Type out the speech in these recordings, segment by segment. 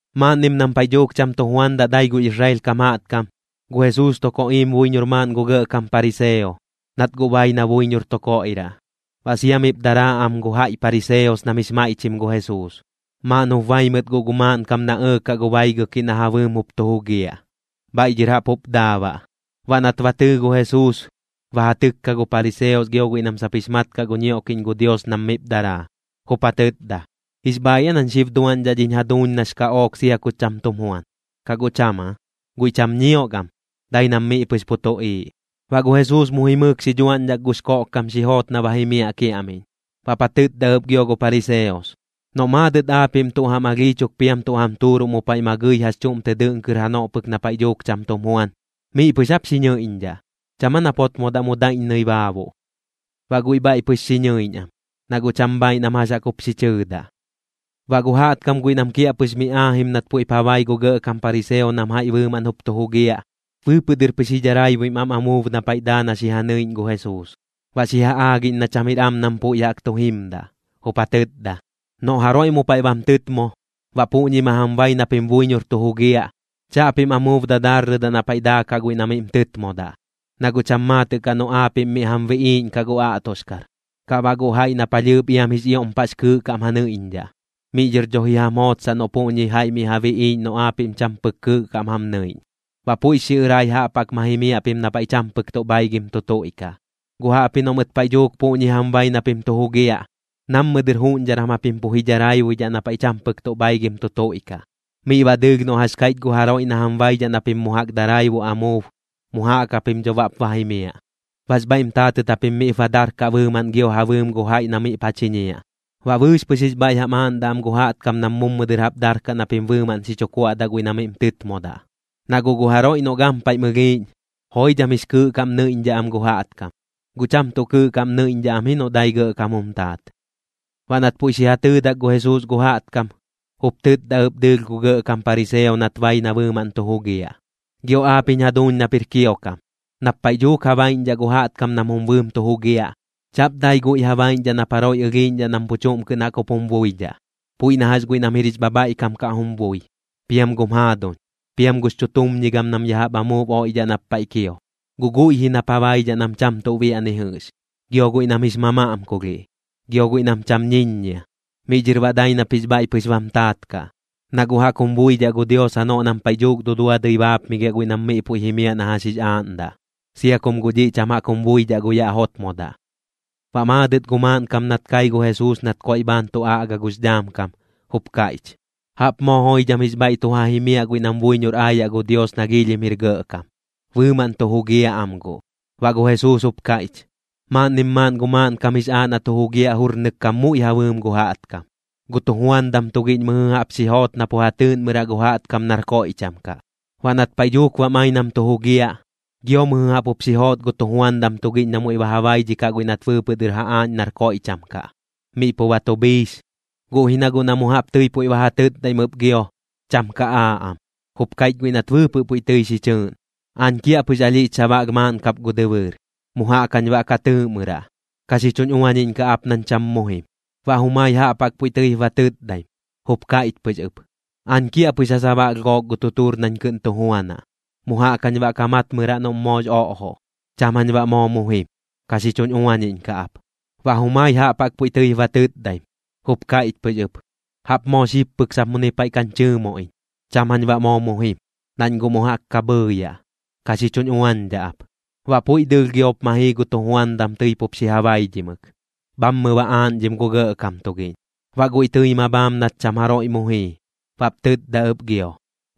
Maaꞌnnim nam paiꞌ dhuuk cham tu juandaꞌ dai gu Israel kam jaꞌtkam, gu Jesuus tu koꞌiim buiñor maaꞌn gu gɇꞌkam pariseo, nat guꞌ bai na buiñor tu koiꞌraꞌ. Baꞌ sia miꞌp daraa am gu jaiꞌ pariseos nam jix maiꞌchim gu Jesuus. Maaꞌn jup bai mɨt guꞌ gu maaꞌnkam na ɇɇkaꞌ gu baigɨkiꞌ na ja bɨɨm jup tu jugiaꞌ, bhaiꞌ dhɨr jaꞌp jup daa baꞌ. Baꞌ nat ba tɨɨ gu Jesuus, ba ja tɨkka gu pariseos gio guiꞌ nam sap jix mat kaꞌ gu ñioꞌkiꞌñ gu Dios nam miꞌp daraa. Jup ja tɨtda: ―¿Jix bhaaiꞌ aa nañ xib duaꞌñdhaꞌ dhiñ jaduuñ nax kaꞌook sia ku cham tum juan, kaꞌ guꞌ cham aa? Guiꞌ cham ñiok am, dai nam miꞌ pɨx pu tuꞌiiꞌ. Baꞌ gu Jesuus mu jimɨɨk xi dhuaꞌñdhak gux koꞌkkam xi joot na ba jimiaꞌ kiaꞌmiꞌñ. Baꞌp ja tɨtda ɨp gio gu pariseos: ―Noꞌt maadɨt aapiꞌm tuꞌ jam alhii chuk piam tuꞌ jam tuuruꞌ mu paiꞌ ma gɨi jax chuꞌm tɨ dɨꞌn kɨr janoꞌ pɨk na paiꞌ dhuuk cham tum juan, ¿miꞌ pɨx jap xi ñɨiꞌñdhaꞌ? ¿Cham aa nap jotmodaꞌ mu daiꞌññɨi baabuꞌ? Baꞌ guiꞌ bhaiꞌ pɨx xi ñɨiꞌñ am, na guꞌ cham bhaaiꞌ nam jax jaꞌk jup xi chɨɨdaꞌ. Baꞌ gu jaꞌtkam guiꞌ nam kiaꞌpɨx mi aajim nat puiꞌp ja bai gu gɇꞌkam pariseo nam jaiꞌ bɨɨmaꞌn jup tu jugiaꞌ, bɨɨpɨꞌ dɨr pɨx ji dharaibuim am amuub na paiꞌ daa na xi ja nɨiꞌñ gu Jesuus. Baꞌ xi ja aagiꞌñ na cham jir am nam puiꞌ jaꞌk tu jimdaꞌ, jup ja tɨtda: ―Noꞌ jaroiꞌ mu paiꞌ bam tɨtmo, baꞌ puꞌñi ma jam bai na pim buiñor tu jugiaꞌ, chaꞌpim amuub dadaarrɨdaꞌ na paiꞌ daakaꞌ guiꞌ na miꞌm tɨtmodaꞌ, na guꞌ cham maatɨꞌ kaꞌ noꞌ aapiꞌm miꞌ jam biꞌiiꞌñkaꞌ gu aꞌtoxkar, kaꞌ baꞌ gu jaiꞌ na palhɨɨp iam jix ioꞌm paꞌx kɨɨꞌ kaꞌm ja nɨiꞌñdhaꞌ. Miꞌ dhɨr dho ji jam jootsaꞌ noꞌ puꞌñi jaiꞌ miꞌ ja biꞌiiꞌñ noꞌ aapiꞌm cham pɨk kɨɨꞌ kaꞌm jam nɨiꞌñ. Baꞌ puiꞌx xiꞌɨꞌrai jaꞌp jaꞌk ma jimiaꞌ pim na paiꞌ cham pɨk tuꞌ bhaigɨm tu tuiꞌkaꞌ. Guꞌ jaꞌpji noꞌ mɨt paiꞌ dhuuk puꞌñi jam bai na pim tu jugiaꞌ, nammɨ dɨr juꞌñdharam japim pɨx pu ji dharaibuidhaꞌ na paiꞌ cham pɨk tuꞌ bhaigɨm tu tuiꞌkaꞌ. Miꞌ baꞌ dɨɨlh noꞌ jax kaiꞌch gu jaroiꞌ na jam baidhaꞌ na pim mu jaꞌk daraibuꞌ amuub, mu jaꞌk japim dho baꞌp ba jimiaꞌ. Baꞌx bhaiꞌm taatɨt japim miꞌp ba darkaꞌ bɨɨmaꞌn gio ja bɨɨm gu jaiꞌ na miꞌp ja chiñiaꞌ, baꞌ bɨɨx pɨx jix bhaiꞌ jam aaꞌndaꞌ am gu jaꞌtkam nam mummɨ dɨr jaꞌp darkaꞌ na pim bɨɨmaꞌn xi chu kuaꞌdaꞌ guiꞌ na miꞌm tɨtmodaꞌ. Na guꞌ gu jaroiꞌ noꞌ gampaiꞌm ɨlhiiꞌñ, joidham jix kɨɨꞌ kaꞌm nɨiꞌñdhaꞌ am gu jaꞌtkam, guꞌ cham tuꞌ kɨɨꞌ kaꞌm nɨiꞌñdhaꞌ am ji noꞌ dai gɇꞌkam jum taat. Baꞌ nat puiꞌ xi ja tɨɨdak gu Jesuus gu jaꞌtkam, jup tɨtda ɨp dɨɨlh gu gɇꞌkam pariseo nat bai na bɨɨmaꞌn tu jugiaꞌ: ―Gio aap jiñ jaduuñ nap jir kiokam, nap paiꞌ dhuuk ja baiꞌñdhaꞌ gu jaꞌtkam nam jum bɨɨm tu jugiaꞌ, chaꞌp dai guiꞌ ja baiꞌñdhaꞌ nap jaroiꞌ ɨlhiiꞌñdhaꞌ nam pu chuꞌm kɨꞌn jaꞌk jup jum buidhaꞌ, puiꞌ na jax guiꞌ nam jir jix bhabhaiꞌkam kaꞌ jum bui, piam gum jaaduñ, piam gux chutumñigam nam ya jaꞌp amuub oiꞌdhaꞌ nap paiꞌ kio. Guꞌ guiꞌ ji nap ja baidhaꞌ nam cham tuꞌ biaꞌ ni jɨꞌx, gio guiꞌ nam jix mamaꞌmkulhiꞌ, gio guiꞌ nam cham ñiññia. Miꞌ dhɨr baꞌ dai nap jix bhaiꞌ pɨx bam taat kaꞌ, na guꞌ jaꞌk jum buidhaꞌ gu Dios janoꞌ nam paiꞌ dhuuk duduadɨi baapmigiaꞌ guiꞌ nam miꞌ puiꞌ jimiaꞌ na jax jix aaꞌndaꞌ, sia kum guꞌ dhiꞌ cham jaꞌk jum buidhaꞌ gu yaꞌ jotmodaꞌ. Baꞌ maadɨt gu maaꞌnkam nat kai gu Jesuus nat koiꞌ bhaan tu aꞌga gux dhaam kam, jup kaiꞌch: ―¡Jaꞌp moo joidham jix bhaiꞌ tu ja jimiaꞌ guiꞌ nam buiñor aayaꞌ gu Dios nax ioꞌm jir gɇꞌkam! ¡Bɨɨmaꞌn tu jugiaꞌ am guꞌ! Baꞌ gu Jesuus jup kaiꞌch: ―Maaꞌnnim maaꞌn gu maaꞌnkam jix aaꞌ na tu jugiaꞌ jurnɨk kam muiꞌ ja bɨɨm gu jaꞌtkam. Gu tujuandam tugiꞌñ mɨjɨ jaꞌp xi joot na pu ja tɨɨꞌnmɨraꞌ gu jaꞌtkam nar koiꞌcham kaꞌ. Baꞌ nat paiꞌ dhuuk bam ai nam tu jugiaꞌ, gio mɨjɨ jaꞌp jup xi joot gu tujuandam tugiꞌñ na muiꞌ ba ja baidhikaꞌ guiꞌ nat bɨɨpɨꞌ dɨr ba ja aaꞌñ nar koiꞌcham kaꞌ, miꞌ pu ba tu bhiix. Guꞌ ji na guꞌ na mu jaꞌp tɨi puiꞌ ba ja tɨtdaim ɨp gio, cham ka aaꞌ am. Jup kaiꞌch guiꞌ nat bɨɨpɨꞌ puiꞌ tɨi xi chɨɨꞌn: “Aañ kiaꞌpɨx alhiꞌch sabaꞌlh maaꞌn kap gu dɨbɨɨr. Mu jaꞌk jañ baꞌ ka tɨɨꞌmɨraꞌ. Ka xi chuñ uañiꞌñkaꞌ ap nañ cham mu jim.” Baꞌ jumai jaꞌp jaꞌk puiꞌ tɨip ba tɨtdaim, jup kaiꞌch pɨx ɨp: “Aañ kiaꞌpɨx ja sabaꞌlh gook gu tutuur nañ kɨꞌn tu juanaꞌ. Mu jaꞌk jañ baꞌ ka matmɨraꞌ noꞌm moox oꞌjoꞌ. Cham jañ baꞌ moo mu jim, ka xi chuñ uañiꞌñkaꞌ ap.” Baꞌ jumai jaꞌp jaꞌk puiꞌ tɨip ba tɨtdaim, jup kaiꞌch pɨx ɨp: “Jaꞌp moo xib pɨk sap muni paiꞌ kañ chɨɨmoꞌ iñ. Cham jañ baꞌ moo mu jim, nañ guꞌ mu jaꞌk ka bhɨɨyaꞌ. Ka xi chuñ uañdhaꞌ ap.” Baꞌ puiꞌ dɨɨlh giop ma jii gu tujuandam tɨi pup xi ja baidhimɨk, bhammɨ ba aaꞌñdhim gu gɇꞌkam tugiꞌñ. Baꞌ guiꞌ tɨi ma bhaam nat cham jaroiꞌ mu jii, baꞌp tɨtda ɨp gio: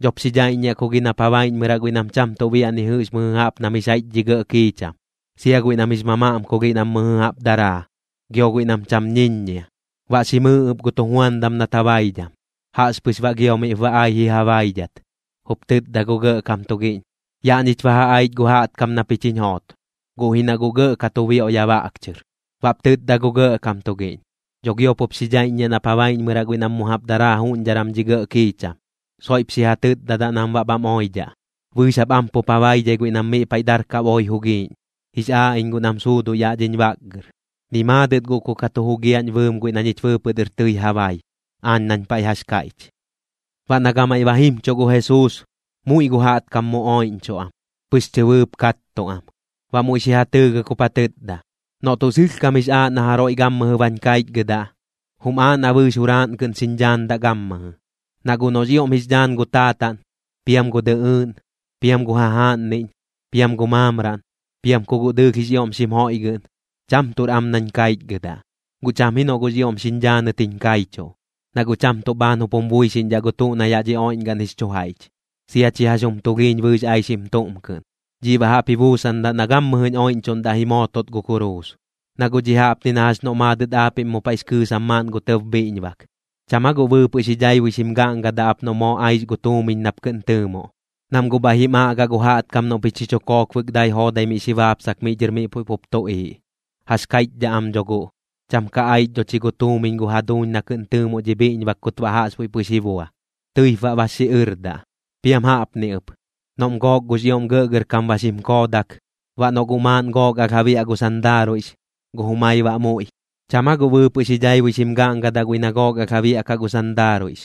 “Dhop xi dhaiꞌññiaꞌ ku gi nap ja baiꞌñmɨraꞌ guiꞌ nam cham tuꞌ biaꞌ ni jɨꞌx mɨjɨ jaꞌp nam jix jaiꞌch dhi gɇꞌ kiicham, sia guiꞌ nam jix mamaꞌmkulhiꞌ nam mɨjɨ jaꞌp daraa, gio guiꞌ nam cham ñiññia.” Baꞌ xi mɨɨ ɨp gu tujuandam nat ja baidham. Jaꞌxpɨx baꞌ gio miꞌp ba ai ji ja baidhat, jup tɨtda gu gɇꞌkam tugiꞌñ: “Yaꞌ ñich ba ja aich gu jaꞌtkam na pich jiñ joot, guꞌ ji na guꞌ gɇꞌ ka tu bioꞌ ya baꞌk chɨr.” Baꞌp tɨtda gu gɇꞌkam tugiꞌñ: “Dho giop jup xi dhaiꞌññiaꞌ nap ja baiꞌñmɨraꞌ guiꞌ nam mu jaꞌp daraa juꞌñdharam dhi gɇꞌ kiicham. Soiꞌp xi ja tɨtdadaꞌ nam baꞌ bham oidhaꞌ. Bɨɨx jap am pup ja baidhai guiꞌ nam miꞌ paiꞌ darkaꞌ boi jugiiꞌñ. Jix aaꞌ iñ guꞌ nam suuduꞌ yaꞌ dhiñ baꞌkgɨr. Ni maadɨt guꞌ ku ka tu jugiaꞌñ bɨɨm guiꞌ na ñich bɨɨpɨꞌ dɨr tɨi ja bai, aañ nañ paiꞌ jax kaiꞌch.” Baꞌ na gamaiꞌ ba jimchuꞌ gu Jesuus, muiꞌ gu jaꞌtkam mu oiꞌñchuꞌ am, pɨx chɨbɨɨp kattuꞌ am. Baꞌ muiꞌ xi ja tɨɨgɨk jup ja tɨtda: ―Noꞌ tuꞌ sɨlhkam jix aaꞌ na jaroiꞌ gammɨjɨ bañ kaichgɨdaꞌ, jum aaꞌ na bɨɨx juraaꞌn kɨꞌn xiñ dhaandaꞌ gammɨjɨ. Na guꞌ noꞌx ioꞌm jix dhaan gu taataꞌn, piam gu dɨꞌɨɨꞌn, piam gu jajaaꞌnniꞌñ, piam gu maamraꞌn, piam ku guꞌ dɨɨlh jix ioꞌm xim joiꞌgɨꞌn, cham tuꞌr am nañ kaichgɨdaꞌ. Guꞌ cham ji noꞌ guꞌx ioꞌm xiñ dhaanɨt jiñ kaichuꞌ, na guꞌ cham tuꞌ bhaan jup jum buixiꞌñdhaꞌ gu tuꞌ na yaꞌ dhi oiꞌñgaꞌn jix chu jaiꞌch, sia chi jax jum tulhiiñ bɨɨx aixim tuꞌm kɨꞌn. Dhiꞌ baꞌ jaꞌp ji buusandaꞌ na gammɨjɨñ oiꞌñchuꞌndaꞌ ji mootot gu kuruus. Na guꞌ dhiꞌ jaꞌpni na jax noꞌ maadɨt aapiꞌm mu paiꞌx kɨɨsam maaꞌn gu tɇb bhiꞌñbak, ¿cham aa guꞌ bɨɨpɨꞌ xi dhaibui xim gaꞌngadaꞌ ap noꞌ moo aix gu tuumiñ nap kɨꞌn tɨɨmoꞌ? Nam guꞌ bhaiꞌ jim aꞌgaꞌ gu jaꞌtkam noꞌ pich xi chu kookbɨk dai joodai miꞌ xi baapsak miꞌ dhɨr miꞌ puiꞌ pup tuꞌiiꞌ. Jax kaiꞌchdhaꞌ am dho guꞌ: “Cham ka aich dho chi gu tuumiñ gu jaduuñ na kɨꞌn tɨɨmoꞌ dhi bhiꞌñbak kut baꞌ jaꞌxbuiꞌ pɨx ji bua.” Tɨip baꞌ bax xiꞌɨrdaꞌ. Piam jaꞌpni ɨp, noꞌm gook gux ioꞌm gɇꞌgɇrkam ba xim koodak, baꞌ noꞌ guꞌ maaꞌn gook alh ja biaꞌ gu sandaaruiꞌx, gu jumai baꞌ muiꞌ, ¿cham aa guꞌ bɨɨpɨꞌ xi dhaibui xim gaꞌngadaꞌ guiꞌ na gook alh ja biaꞌkaꞌ gu sandaaruiꞌx,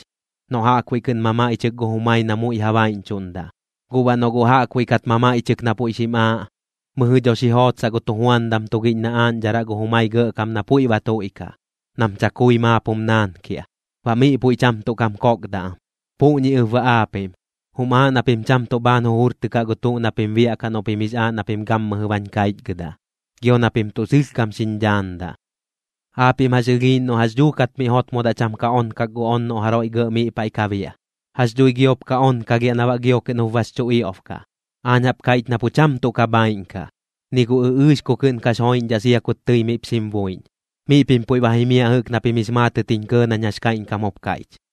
noꞌ jaꞌkbuiꞌ kɨꞌn mamaiꞌchɨk gu jumai na muiꞌ ja baiꞌñchuꞌndaꞌ? Guꞌ baꞌ noꞌ guꞌ jaꞌkbuiꞌ kat mamaiꞌchɨk na puiꞌ xim aaꞌ, mɨjɨ dho xi jootsaꞌ gu tujuandam tugiꞌñ na aaꞌñdharaꞌ gu jumai gɇꞌkam na puiꞌ ba tuiꞌkaꞌ, nam chakui maap jum naankiaꞌ. Baꞌ miꞌ puiꞌ cham tuꞌ kam kokdaꞌ am. Puꞌñi ɨp baꞌ aapiꞌm, jum aaꞌ na pim cham tuꞌ bhaan jujurtɨkaꞌ gu tuꞌ na pim biaꞌkaꞌ noꞌ pim jix aaꞌ na pim gammɨjɨ bañ kaichgɨdaꞌ, gio na pim tuꞌ sɨlhkam xiñ dhaandaꞌ. ’¿Aapiꞌm jax ɨlhiiꞌñ noꞌ jax dhuukat miꞌ jotmodaꞌ cham ka onkak gu on noꞌ jaroiꞌ gɇꞌ miꞌ paiꞌ ka biaꞌ? ¿Jax dhui giop ka onkalhiaꞌ na baꞌ gio kɨꞌn jup bax chu ioꞌb kaꞌ? Aañ jaꞌp kaiꞌch na pu cham tuꞌ ka bhaiꞌn kaꞌ, ni gu ɨꞌɨɨx ku kɨꞌn kax joiꞌñdhaꞌ sia kut tɨi miꞌp xim buiꞌñ. Miꞌ pim puiꞌ ba jimiaꞌ jɨꞌk na pim jix maatɨt jiñ kɇɇ nañ jax kaiꞌñkam jup kaiꞌch.